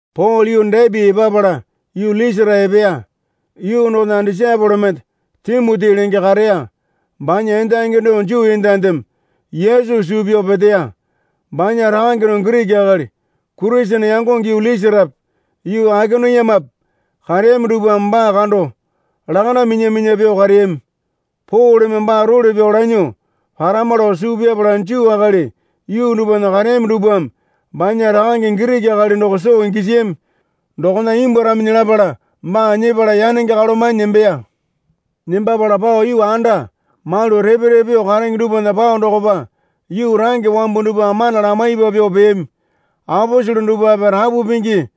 Pole yuu Depi epapala yuu Lisara epeya. Yuu dokona disaepole mende Timoti lenge kareya. Banya endangi doko Juu endandeme Yesu suu pyao peteya. Banya rakange doko Giriki akali. Kurisene yangonge yuu Lisarape yuu Aikoniumape kareyami dupwame baa kando lakanda minya minya pyuo kareyami. Poleme baa role pyao lanyuo parama lao suu pyapala Juu akali yuu dupwana kareyami dupwame banya rakange Giriki akali doko soo gisiyami dokona imbwuaraminyi lapala baa nyepala yanenge kalomanyi nembeya. Nembapala pao yuu anda malu repe repe pyuo karenge dupwana pao dokopa yuu range wambu dupwa mana lamaipa pyuo peyami. Aposele dupwape rapu pingi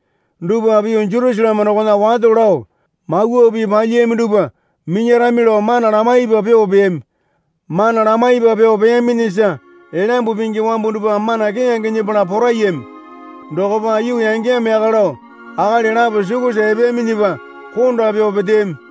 dupwape yuu Jerusaleme dokona wato lao mawa pii palyiyami dupwa minyarami lao mana lamaipa pyuo peyami. Mana lamaipa pyuo peyaminyisa Elyambu Pingi wambu dupwa mana keyange nyepala poraiyami. Dokopa yuu yangeyamo yaka lao akali lapo sukusa epeyaminyipa konda pyuo peteyami.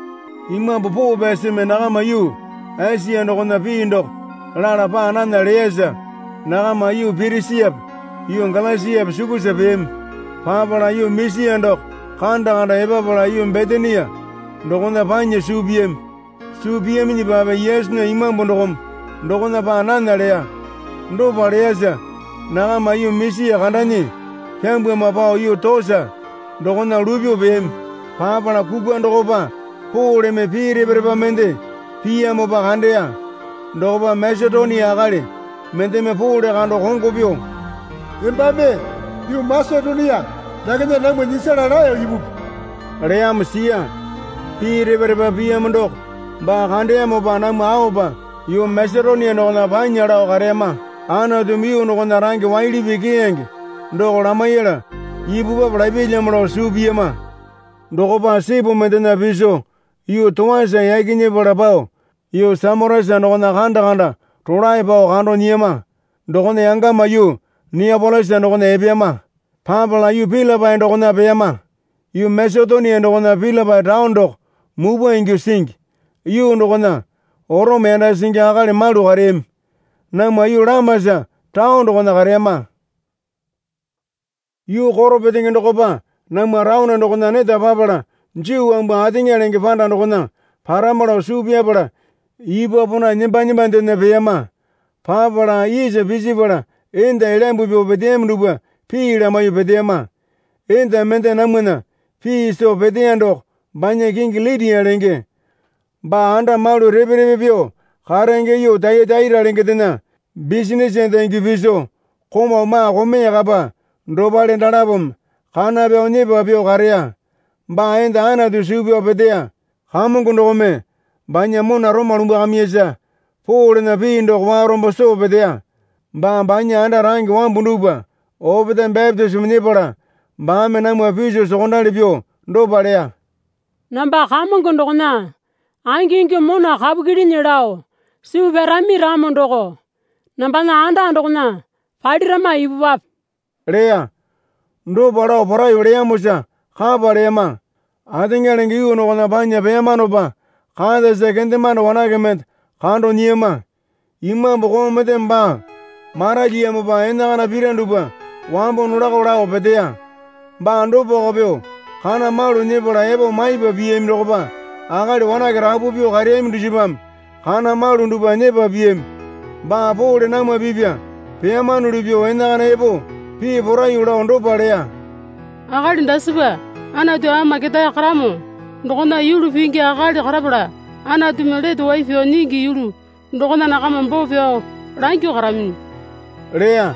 Imambu Poo Pyasimi nakama yuu Esia dokona pii doko lala paa nana leyasa nakama yuu Pirisiape yuu Galasiape sukusa peyami. Papala yuu Misia doko kanda kanda epapala yuu Bitinia dokona panya suu piyami. Suu piyaminyipape Yesunya Imambu dokome dokona paa nana leya. Dopa leyasa nakama yuu Misia kandanyi pyambana pao yuu Toasa dokona luypyuo peyami. Papala kukwa dokopa Poleme pii repa repa mende piyamopa kandeya. Dokopa Masetonia akali mendeme Pole kando kongo pyuo, Embame yuu Masetonia dakena namwa nyisala laeyo ipupi, leyamo siya. Pii repa repa piyamo doko baa kandeyamopa namwa aopa yuu Masetonia dokona panya lao kareyama. Anatumi yuu dokona range waili pii keyange doko lamaiyala ipupwape lapyalyamo lao suu piyama. Dokopa sipu mendena piso yuu Toasa yaki nyepala pao yuu Samotesa dokona kanda kanda rolae pao kando nyiyama. Dokona yangama yuu Niapolisa dokona epeyama. Papala yuu Pilipai dokona peyama. Yuu Masetonia dokona Pilipai taone doko mupwa ingyuo singi. Yuu dokona Orome yanda singi akali malu kareyami. Namwa yuu lamasa taone dokona kareyama. Yuu koro petenge dokopa namwa taone dokona neta papala Juu wambu ateŋa lenge panda dokona parama lao suu pyapala ipwa pona nemba nembandena peyama. Papala isa pisipala enda elyambu pyuo peteyami dupwa pii lamaiyuo peteyama. Enda mende namwana pii soo peteya doko banya kingi Litia lenge. Baa anda malu repe repe pyuo karenge yuu Tayataira lengendena bisinase enda ingyuo piso komau maa komeya kapa dopale dalapome kana pyao nyepa pyuo kareya. Baa enda Anatu suu pyao peteya. Kamongo dokome banya mona roma lumbwakamiyasa Polena pii doko warombo soo peteya. Baa banya anda range wambu dupwa opetae bapitisimo nyepala baame namwa piso sokondali pyuo dopa leya. Namba Kamongo dokona angingyuo mona kapu kyilinyi lao suu pyarami ramo doko nambana anda dokona palirama ipupwape leya. Dopa lao poraiyuo leyamosa kapa leyama. Ateŋa lenge yuu dokona panya peyamanopa katasa kendemande wanake mende kando nyiyama. Imambu koo mendeme baa maralyiyamopa enakana pira dupwa wambo nolako lao peteya. Baa dopako pyuo kana malu nyepala epo maipa piyami dokopa akali wanake rapu pyuo kareyami dusipame kana malu dupwa nyepa piyami. Baa Pole namwa pipya peyamanuli pyuo enakana epo pii poraiyuo lao dopa leya. Akali dasipa Anatu Ama Ketae Karamo dokona yulu pingi akali karapala Anatumi lete wai pyao nyingi yulu dokona nakama boo pyao langyuo karaminyi leya.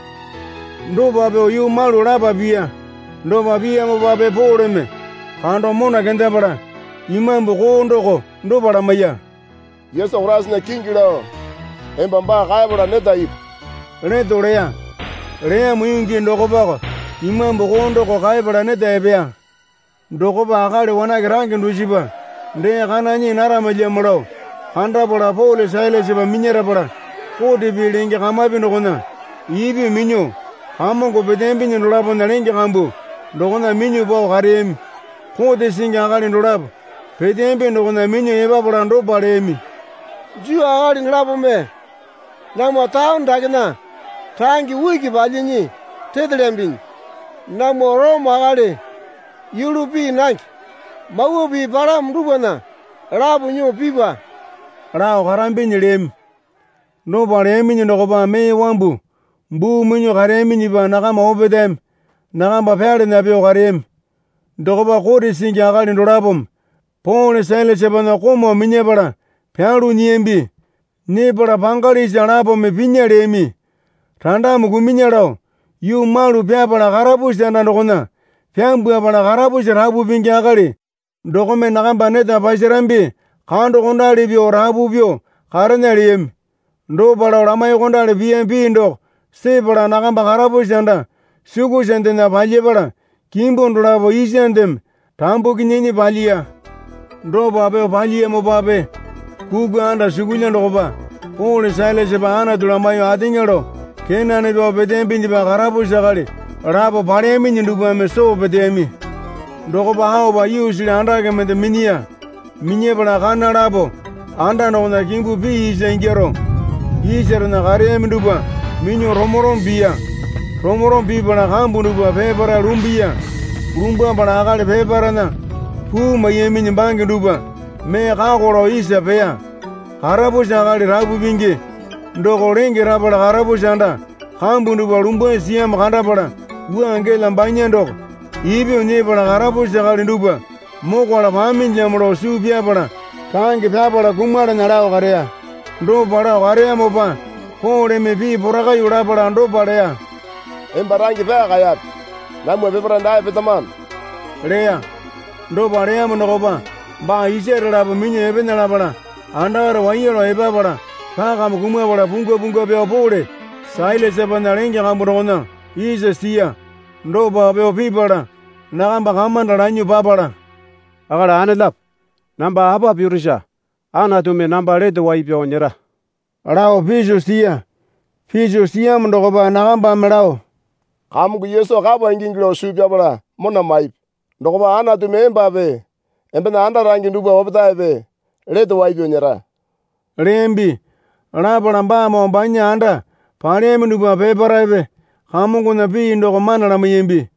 Dopa pyuo yuu malu lapa piya. Dopa piyamopape Poleme kando mona kendapala imambu koo doko dopa lamaiya. Yesu Koraisana kingi lao emba baa kaepala neta ipu leto leya. Leyamo yuu gii dokopako imambu doko kaepala neta epeya. Dokopa akali wanake range dusipa dee kana nyii naramalyamo lao kandapala Pole Sailasapa minyarapala kote pii lenge kamapi dokona ipyuo minyuo kamongo peteyambinyi dolapona lenge kambu dokona minyuo pao kareyami. Kote singi akali dolapo peteyambi dokona minyuo epapala dopa leyami. Juu akali dolapome namwa taone dakena range uki palyinyi retelyambinyi. Namwa Orome akali yulu pii nange mawa pii palamo dupwana lapo nyuo pipa lao karambinyi leyami. Dopa leyaminyi dokopa mee wambu buu minyuo kareyaminyipa nakama opetaeme nakamba pyalana pyuo kareyami. Dokopa kote singi akali dolapome Pole Sailasapana komau minyapala pyalu nyiyambi. Nyepala pangali isa lapome pinya leyami. Randame kumunya lao yuu malu pyapala karapusi anda dokona pyambwapala karapusi rapu pingi akali dokome nakamba neta pasarambi kandokondali pyuo rapu pyuo karena leyami. Dopa lao lamaiyuokondali piyami pii doko sepala nakamba karapusi anda sukusandena palyapala kimbu dolapo isandeme rambukinyinyi palyiya. Dopa pyuo palyiyamopape kukwa andasukulya dokopa Pole Sailasapa Anatu lamaiyuo ateŋa lao kenane pyao peteyambinyipa karapusi akali lapo paleyaminyi dupwame soo peteyami. Dokopa aopa yuusili andake mende minyiya. Minyapala kana lapo anda dokona kimbu pee isa ingyaro isarena kareyami dupwa minyuo romo romo piya. Romo romo pipala kambu dupwa peparae lumbuya. Lumbwapala akali peparaena puu maiyaminyi bange dupwa mee kako lao isa peya. Karapusi akali rapu pingi doko lenge rapala karapusi anda kambu dupwa lumbwasi siyamo kandapala wua gela banya doko ipyuo nyepala karapusi akali dupwa mokwala paminyilamo lao suu pyapala range nyepala kumalana lao kareya. Dopa lao kareyamopa Poleme pii porakaiyuo lapala dopa leya. Emba range pyaa kaeyape. Namwa peparae dae petamano leya. Dopa leyamo dokopa baa isare lapo minyuo epena lapala andakare waiya lao epapala pakame kumapala pungwa pungwa pyao Pole Sailasapana lenge kambu dokona isa siya. Dopa pyuo pipala nakamba kamanda lanyuo papala, Akali anelapo, namba apa pirusa Anatumi namba lete wai pyao nyera? lao piso siya. Piso siyamo dokopa nakambame lao, Kamongo Yesu kapa ingingi lao suu pyapala mona maipi. Dokopa Anantumi embape embena anda range dupwa opetaepe lete wai pyao nyera leyambi. Lapala baamoo banya anda paleyami dupwa peparaepe Kamongona pii doko mana lamaiyambi.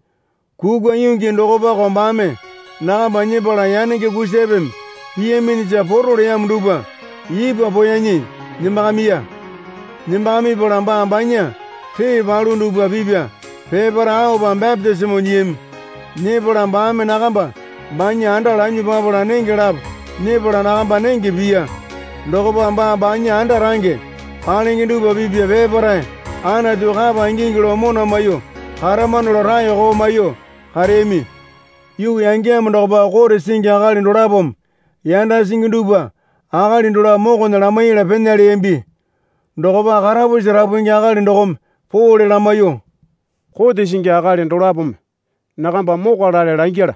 Kukwa yuu gii dokopako baame nakamba nyepala yanenge kusapeme piyaminyisa poro leyamo dupwa ipwa poeyanyi nembakamiya. Nembakamipala baa banya ree palu dupwa pipya peparae aopa bapitisimo nyiyami. Nyepala baame nakamba banya anda lanyuo papala nenge lapo nyepala nakamba nenge piya. Dokopa baa banya anda range palenge dupwa pipya peparae Anatu kapa ingingi lao mona maiyuo karamano lao raeko maiyuo kareyami. Yuu yangeyamo dokopa kote singi akali dolapome yanda singi dupwa akali dolapo mokona lamaiyala pena leyambi. Dokopa karapusi rapu pingi akali dokome Pole lamaiyuo, Kote singi akali dolapome nakamba mokwalale langyala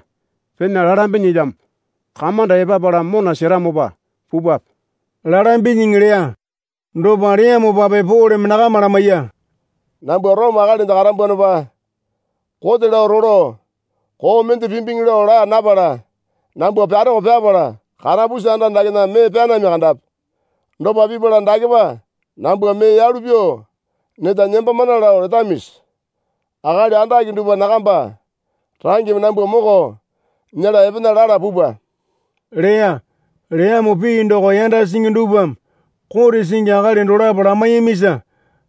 pena lalambinyilamo. Kamanda epapala mona seramopa pupwape, lalambinyiŋi leya. Dopa leyamopape Poleme nakama lamaiya. Nambwa Orome akalinde karambwanopa kote lao rolo koo mende pimbiŋi lao laa napala nambwa pyaroko pyapala karapusi anda dakena mee pyanami kandapi. Dopa pipala dakepa nambwa mee yalu pyuo neta nembamana lao letamisi? Akali andake dupwa nakamba rangeme nambwa moko nyela epena lala pupwa, leya. Leyamo pii doko yanda singi dupwame kote singi akali dolapo lamaiyamisa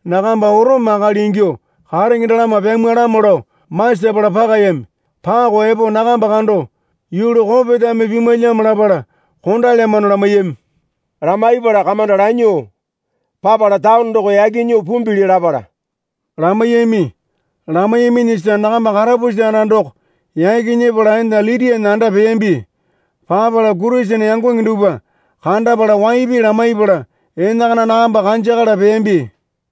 nakamba Orome akali ingyuo karenge dalama pyamwalamo lao masapala pakayami. Pako epo nakamba kando yulu kopetame pimwalyamo lapala kondalyamano lamaiyami. Lamaipala kamanda lanyuo papala taone doko yaki nyuo pumbili lapala lamaiyami. Lamaiyaminyisa nakamba karapusi anda doko yaki nyepala enda Litiana anda peyambi. Papala Kurisene yangonge dupwa kandapala waipi lamaipala enakana nakamba kanjakala peyambi.